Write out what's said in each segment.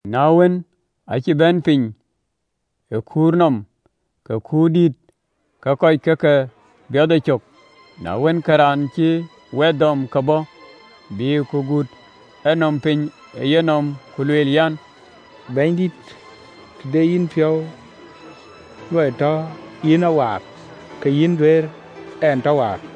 Na wën, acï bɛ̈n piny ë kuur nɔm, ke kuut dït ke kɔc ke ke biɔth yecök. Na wën, ke raan cïï wɛth dɔm ke bɔ̈, bïï ku gut enɔm piny ë yenɔm, ku lueel an, “Bɛ̈nydït, të de yïn piɔ̈u luɔi tɔ yïn a waar, ke yïn duëër ɛn tɔ waar.”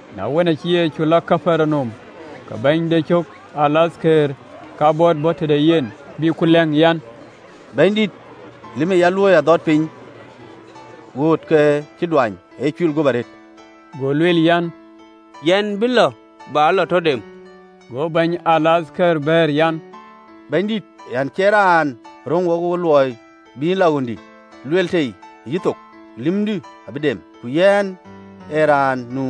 Na wën, acï Yecu lɔ Kapernaum, ke bɛ̈ny de cök alathkëër kabɔt bɔ̈ tëde yen, bï ku lɛ̈ŋ, an, “Bɛ̈nydït, lïm ee ya luööi adhɔt piny ɣööt, ke cï duany, acï cuil guöp arëët.” Go lueel an, “Yɛn bï lɔ bä lɔ tɔ dem.” Go bɛ̈ny alathkëër bɛ̈ɛ̈r an, “Bɛ̈nydït, yɛn cie raan röŋ wokë luɔi bï yïn lɔ ɣöndï, lueel tei ë yïthok, ke lïmdï bï dem. Ku yɛn ee raan nu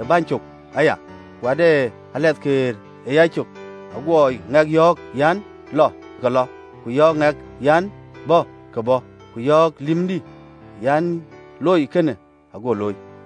ë bɛ̈ny cök aya, ku dɛ alathkëër ë yacök, aguɔ ŋɛk yɔ̈ɔ̈k an, ‘Lɔɔr’, ke lɔ, ku yɔ̈ɔ̈k däŋ an, ‘Bäär,’ ke bɔ̈, ku yɔ̈ɔ̈k lïmdï an, ‘Loi kënë,’ ago looi.”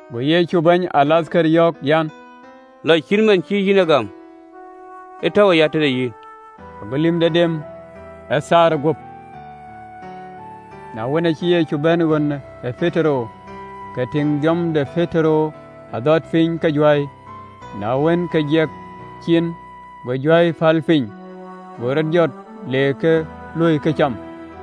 Go Yecu bɛ̈ny alathkëër yɔ̈ɔ̈k an, “Lɔ, cït man cï yïn ë gam, ë tɔ̈u aya tëde yïn.” Ago lïmde dem ë thaarë guöp. Na wën, acï Yecu bɛ̈n ɣön ë Petero, ke tïŋ dhiɔm de Petero adhɔt piny ke juäi. Na wën, ke jiɛk cin, go juäi päl piny, go rɔt jɔt, le keek luöi këcam.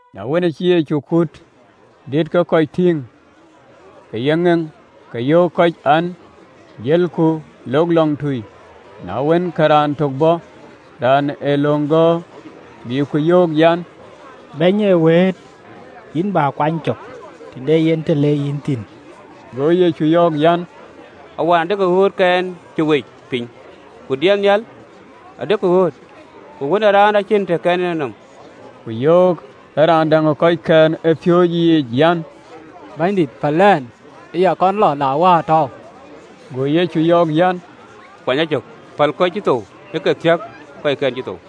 Na wën, cï Yecu kuut dït ke kɔc tïŋ ë yeŋeŋ, ke yöök kɔc an, Jëlku lok lɔŋtui. Na wën, ke raan tök bɔ̈, raan ë löŋ gɔ̈ɔ̈r, bï ku yöök an, “Bɛ̈ny ë wëët, yïn bä kuany cök, të de yen të le yïn thïn.” Go Yecu yɔ̈ɔ̈k an, “Awɛn adekï ɣöötkɛn cï wec piny, ku diɛt nhial adekï ɣööt, ku Wën ë Raan acïn të kɛn en enɔm.” Ku yöök ë raan däŋ ë kɔckɛn ë piööcë yiic an, “Bɛ̈nydït, päl ɛn ë ya kɔn lɔ la waar tɔ̈ɔ̈u.” Go Yecu yöök an, “kuany a cök, päl kɔc cï thou ë ke thiäk kɔckɛn cï thou.”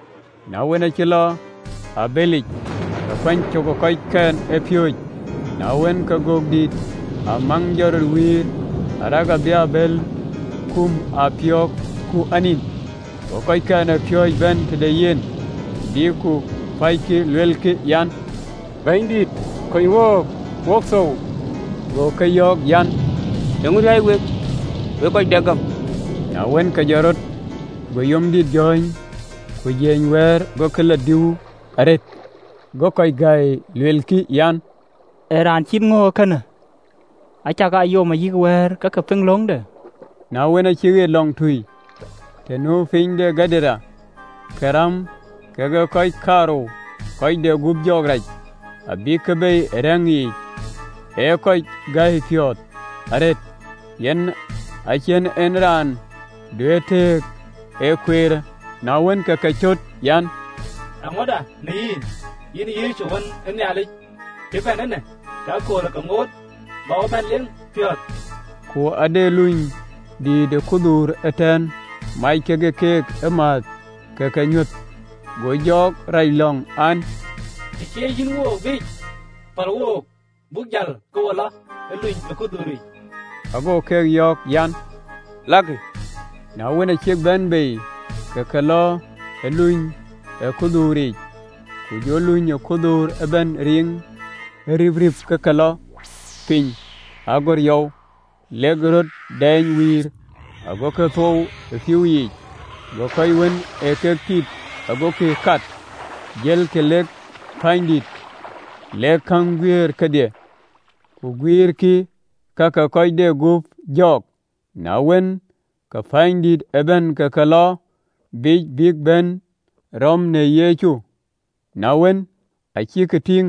Na wën, acï lɔ ë abëlic, ke kuany cök ë kɔckɛn ë piööcë. Na wën, ke gök dïït ë amaŋ jɔt rɔt wiir, arëk abï abël kum ë apiöök, ku anin. Go kɔckɛn ë piööcë bɛ̈n tëde yen, bïk ku päckï, lueelkï an, “Bɛ̈nydït, kony wook, wok thou.” Go keek yɔ̈ɔ̈k an, “Eeŋö riääc wek, wek kɔc dɛk ë gam?” Na wën, ke jɔt rɔt, go yom dït jɔ̈ɔ̈ny ku jiëëny wɛɛr, gokï lɔ dui arëët. Go kɔc gäi, luelkï an, “Ee raan cït ŋö ee kënë, acakaa yom ayï wɛ̈ɛ̈r ke ke piŋ löŋde?” Na wën, acï ɣet lɔŋtui, të nu piny de kɔc ke Gadaren, ke räm kekë kɔc kaarou kɔc de gup jɔɔk rac, abïkï bei ë rɛ̈ŋ yiic, ee kɔc gäi piɔ̈ɔ̈th arëët, an a cïn en raan duëër tëëk ë kueerë. Na wën, ke ke cöt an, “Eeŋöda në yïn, yïn Yecu, Wën ë Nhialic? Cï bɛ̈n eenë ke akööl ë ke ŋoot, bä wo bɛ̈n leeŋ piɔ̈ɔ̈th?” Ku de luny dïït ë kudhuur ëtɛ̈ɛ̈n, amec ke keek ëmääth, ke ke nyuäth. Go jɔɔk rac lɔŋ an, Të cieec yïn wook biic, päl wook, buk jäl ke wo lɔ ë luny ë kudhuuric.” Ago keek yɔ̈ɔ̈k an, “Lakï. Na wën, acïk bɛ̈n bei, ke ke lɔ ë luny ë kudhuuric, ku jɔ luny ë kudhuur ëbɛ̈n riŋ ërïpïp ke ke lɔ piny agör yɔu, lek röt dɛɛny wiir, agokï thou ë pïïu yiic. Go kɔc wën ë keek tiit gokï kat jëlkï lek pänydït, lek käŋ guiir kedhie, ku guiirkï ka ke kɔc de gup jɔɔk. Na wën, ke pänydït ëbɛ̈n ke ke lɔ biic bïk bɛ̈n rɔ̈m në Yecu, na wën, acïk tïŋ,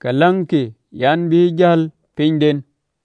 ke läŋkï an, bï jäl pinyden.